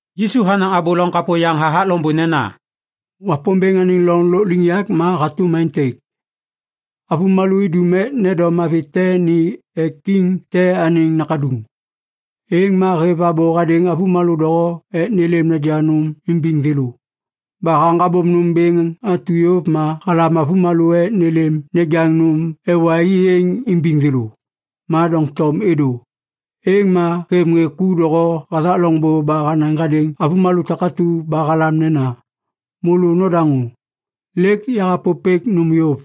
Yisu hanaŋ abô loŋ kapô yaŋ hathak loŋbô nena, “Wapômbêŋ anêŋ loŋ lôkliŋyak ma hatôm aêntêk. Avômalô idum ek nendom avi te ni ek kiŋ te anêŋ nakaduŋ. Êŋ ma hêv abô hadêŋ avômalô doho ek nêlêm nejaŋ nôm imbiŋ thêlô. Ba haŋgabôm nôm bêŋ atu yôv ma halam avômalô ek nêlêm nejaŋ nôm ewa i êŋ imbiŋ thêlô. Ma doŋtom êdô. “Êŋ ma hêv ŋê ku doho hathak loŋbô ba hanaŋ hadêŋ avômalô takatu ba halam nena, ‘Môlô nodaŋô! Lêk yahapôpêk nôm yôv.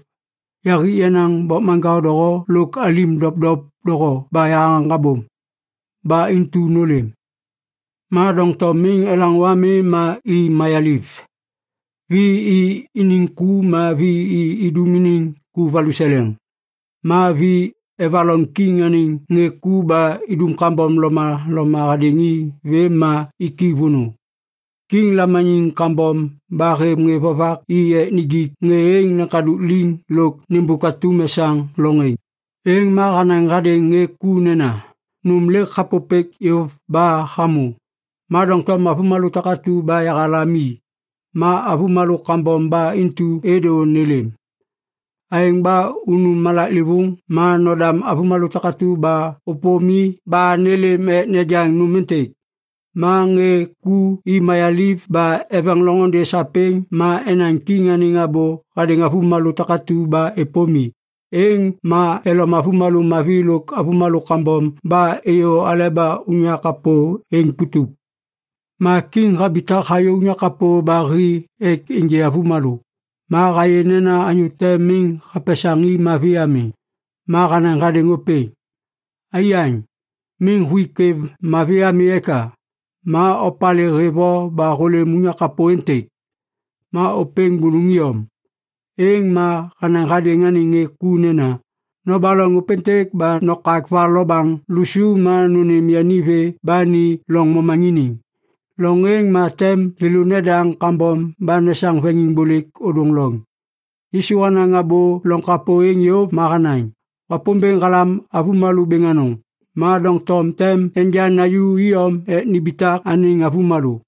Yahik yenaŋ bokmaŋkao doho lôk alim dopdop doho ba yahaŋgabôm! Ba intu nôlêm!’ “Ma doŋtom miŋ elaŋô ami ma i mayaliv. Vi i iniŋ ku ma vi i idum iniŋ ku valuseleŋ. Ma vi evaloŋ kiŋ anêŋ ŋê ku ba idum kambom lomaloma hadêŋ i vêm ma iki vônô. Kiŋ lamaniŋ kambom ba hêv ŋê vovak i ek nijik ŋê êŋ leŋkadôk liŋ lôk nêmbôk atum esaŋ loŋ êŋ. “Êŋ ma hanaŋ hadêŋ ŋê ku nena, ‘Nôm lêk yahapôpêk yôv ba hamô. Ma doŋtom avômalô takatu ba yahalam i, ma avômalô kambom ba intu êdô nêlêm. Aêŋ ba unu malaklêvôŋ ma nodam avômalô takatu ba ôpôm i ba nêlêm ek nejaŋ nôm êntêk.’ Ma ŋê ku i mayaliv ba eveŋ loŋôndê sapêŋ ma enaŋ kiŋ anêŋ abô hadêŋ avômalô takatu ba êpôm i. Êŋ ma elom avômalô mavi lôk avômalô kambom ba êyô aleba unyak kapô êŋ putup. “Ma kiŋ habitak hayô unyak kapô ba hi ek ênjê avômalô, ma hayê nena anyô te miŋ hapesaŋ i mavi ami. Ma hanaŋ hadêŋ ôpêŋ, ‘Aiyaŋ, miŋ huik kwêv mavi ami eka? Ma opalê hêv o ba hôlêm unyak kapô êntêk?’ Ma ôpêŋ bônôŋ iyom. “Êŋ ma hanaŋ hadêŋ anêŋ ŋê ku nena, ‘Nobaloŋ ôpêntêk ba nokak va lo baŋ lusu ma nônêm yani vê ba ni loŋ momaŋiniŋ. Loŋ êŋ ma tem thêlô nedaŋ kambom ba nesaŋ veŋiŋbôlêk ôdôŋ loŋ.’” Yisu hanaŋ abô loŋ kapô êŋ yôv ma hanaŋ, “Wapômbêŋ halam avômalô bêŋ anôŋ, ma doŋtom tem enja naju iyom ek nimbitak anêŋ avômalô.”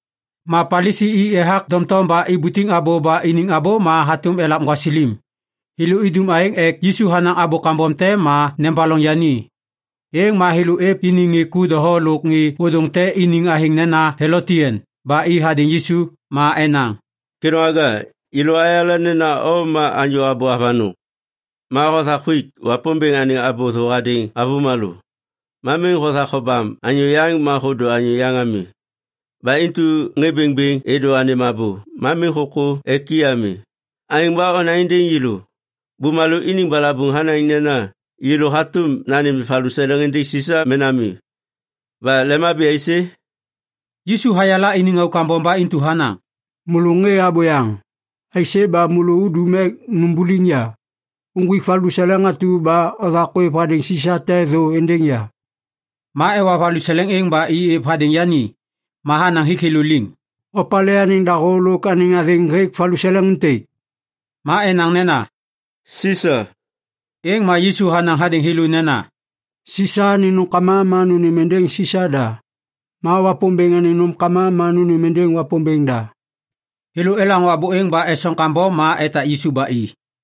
Ma Palisi i ethak doŋtom ba ibutiŋ abô ba iniŋ abô ma hatôm elav gwasilim. Thêlô idum aêŋ ek Yisu hanaŋ abô kambom te ma nebaloŋ yani. Êŋ ma thêlô êv iniŋ ŋê ku doho lôk ŋê ôdôŋ te iniŋ athêŋ nena “Helotian” ba i hadêŋ Yisu. Ma enaŋ, “Kêdôŋwaga, yêlô ayala nena o ma anyô abô avanôŋ. Ma hothak huik Wapômbêŋ anêŋ abô thô hadêŋ avômalô. Ma miŋ hothak hobam anyô yaŋ ma hôdô anyô yaŋ ami. Ba intu ŋê bêŋbêŋ êdô anêm abô, ma miŋ hôkô ek i ami. Aêŋ ba onaŋ êndêŋ yêlô. Bumalô iniŋ balabuŋ hanaŋ nena yêlô hatôm nanêm valuseleŋ êndêŋ Sisa mena mi? Ba lemhabi aisê?” Yisu hayala iniŋ auk kambom ba intu hanaŋ, “Môlô ŋê abôyaŋ! Aisê ba môlô udum ek numbuliŋ ya? Uŋgwik valuseleŋ atu ba othak ôêv hadêŋ Sisa te thô êndêŋ ya.” Ma ewa valuseleŋ êŋ ba i êv hadêŋ yani. Ma hanaŋ hik thêlô liŋ, “Opalê anêŋ dahô lôk anêŋ athêŋ hêk valuseleŋ êntêk?” Ma enaŋ nena, “Sisa.” Êŋ ma Yisu hanaŋ hadêŋ thêlô nena, “Sisa anêŋ nômkama ma nônêm êndêŋ Sisa da. Ma Wapômbêŋ anêŋ nômkama ma nônêm êndêŋ Wapômbêŋ da.” Thêlô elaŋô abô êŋ ba esoŋ kambom ma etak Yisu ba i.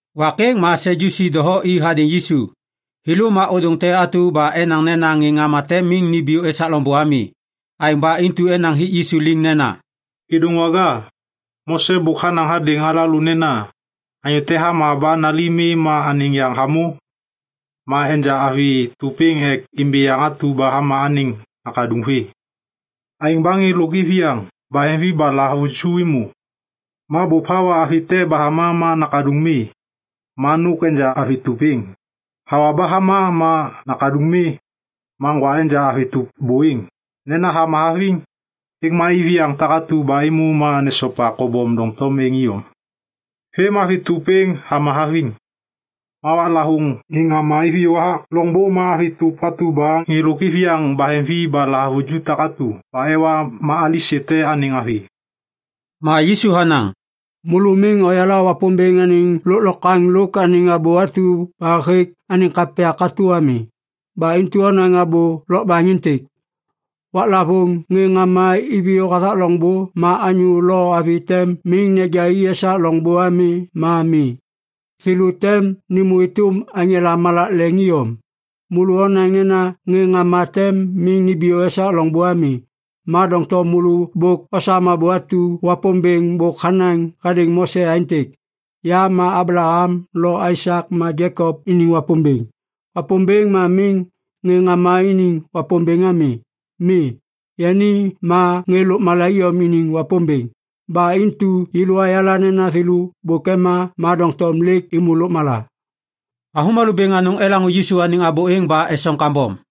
Wak êŋ ma Sadyusi doho i hadêŋ Yisu. Thêlô ma ôdôŋ te atu ba enaŋ nena ŋê ŋama tem miŋ nimbiyô esak loŋbô ami. Aêŋ ba intu enaŋ hik Yisu liŋ nena, “Kêdôŋwaga, Mose bôk hanaŋ hadêŋ alalô nena, ‘Anyô te hama ba nali mi ma anêŋ yaŋ hamô, ma enja avi tôp êŋ ek imbi yaŋ atu ba hama anêŋ nakaduŋ vê.’ Aêŋ ba ŋê lôk iviyaŋ baheŋvi ba lahavuju êmô. Ma bôp hawa avi te ba hama ma nakaduŋ mi. Ma nôk enja avi tôp êŋ, hawa ba hama ma nakaduŋ mi. Ma ŋgwa enja avi tôp bô êŋ, nena hama haviŋ. Êŋ ma iviyaŋ takatu ba êmô ma nesopa kobom doŋtom êŋ iyom. Vêm ma avi tôp êŋ hama haviŋ. Ma waklavôŋ ŋê ŋama iviyô hathak loŋbô ma avi tôp atu ba ŋê lôk iviyaŋ baheŋvi ba lahavuju takatu ba ewa ma alisê te anêŋ avi?” Ma Yisu hanaŋ, “Môlô miŋ oyala Wapômbêŋ anêŋ lôklokwaŋ lôk anêŋ abô atu ba hêk anêŋ kapya katô ami. Ba intu onaŋ abô lokbaŋ êntêk. Waklavôŋ ŋê ŋama iviyô hathak loŋbô, ma anyô lo avi tem miŋ neja i esak loŋbô ami ma mi. Thêlô tem nêmô êtôm aŋela malak leŋ iyom. “Môlô onaŋ nena ŋê ŋama tem miŋ nimbiyô esak loŋbô ami. Ma doŋtom môlô bôk osam abô atu Wapômbêŋ bôk hanaŋ hadêŋ Mose aêntêk, ‘Ya ma Ablaham lo Aisak ma Jekop iniŋ Wapômbêŋ.’ Wapômbêŋ ma miŋ ŋê ŋama iniŋ Wapômbêŋ ami. Mi, yani ma ŋê lôkmala iyom iniŋ Wapômbêŋ. Ba intu yêlô ayala nena thêlô bôk ema, ma doŋtom lêk êmô lôkmala.” Avômalô bêŋ anôŋ elaŋô Yisu anêŋ abô êŋ ba esoŋ kambom.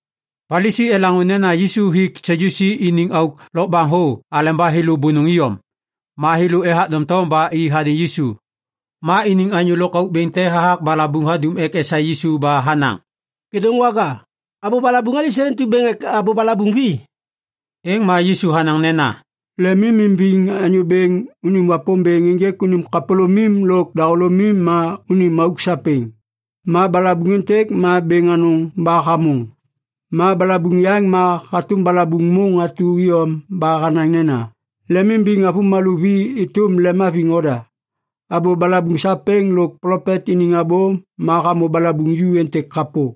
Palisi elaŋô nena Yisu hik Sadyusi iniŋ auk lokbaŋ thô aleba thêlô bônôŋ iyom. Ma thêlô ethak doŋtom ba i hadêŋ Yisu. Ma iniŋ anyô lôkauk bêŋ te hathak balabuŋ hadum ek esaê Yisu ba hanaŋ, “Kêdôŋwaga, abô balabuŋ alisê intu bêŋ ek abô balabuŋ vi?” Êŋ ma Yisu hanaŋ nena, “‘Lemimimbiŋ Anyô Bêŋ unim Wapômbêŋ ênjêk unim kapôlômim lôk dahôlômim ma unim auk sapêŋ.’ Ma balabuŋ êntêk ma bêŋ anôŋ ba hamôŋ. Ma balabuŋ yaŋ ma hatôm balabuŋ môŋ atu iyom ba hanaŋ nena, ‘Lemimbiŋ avômalô vi êtôm lemhaviŋ oda.’ Abô balabuŋ sapêŋ lôk plopet iniŋ abô ma hamô balabuŋ ju êntêk kapô.”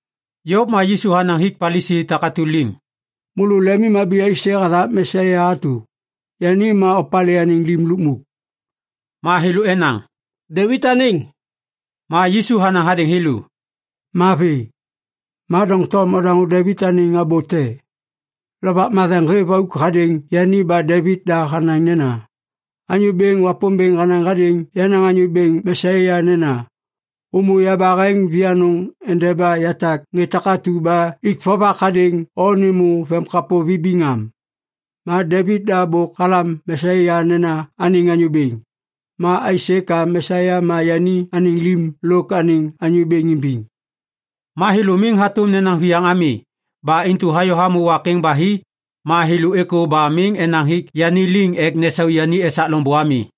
Yôv ma Yisu hanaŋ hik Palisi takatu liŋ, “Môlô lemimhabi aisê hathak Mesia atu? Yani ma opalê anêŋ lim lukmuk?” Ma thêlô enaŋ, “Devit anêŋ.” Ma Yisu hanaŋ hadêŋ thêlô, “Mavi. Ma doŋtom odaŋô Devit anêŋ abô te. Lovak Matheŋ hêv auk hadêŋ yani ba Devit da hanaŋ nena, “‘Anyô Bêŋ Wapômbêŋ hanaŋ hadêŋ yenaŋ Anyô Bêŋ Mesia nena, “Ômô yabaheŋ vianôŋ endeba yatak ŋê takatu ba ik vovak hadêŋ o nêmô vemkapô vibiŋ am.” ’ Ma Devit da bôk halam Mesia nena anêŋ Anyô Bêŋ. Ma aisê ka Mesia ma yani anêŋ lim lôk anêŋ Anyô Bêŋ imbiŋ?” Ma thêlô miŋ hatôm nenaŋ viyaŋ ami. Ba intu hayô hamô wak êŋ ba hi, ma thêlô êkô ba miŋ enaŋ hik yani liŋ ek nesau yani esak loŋbô ami.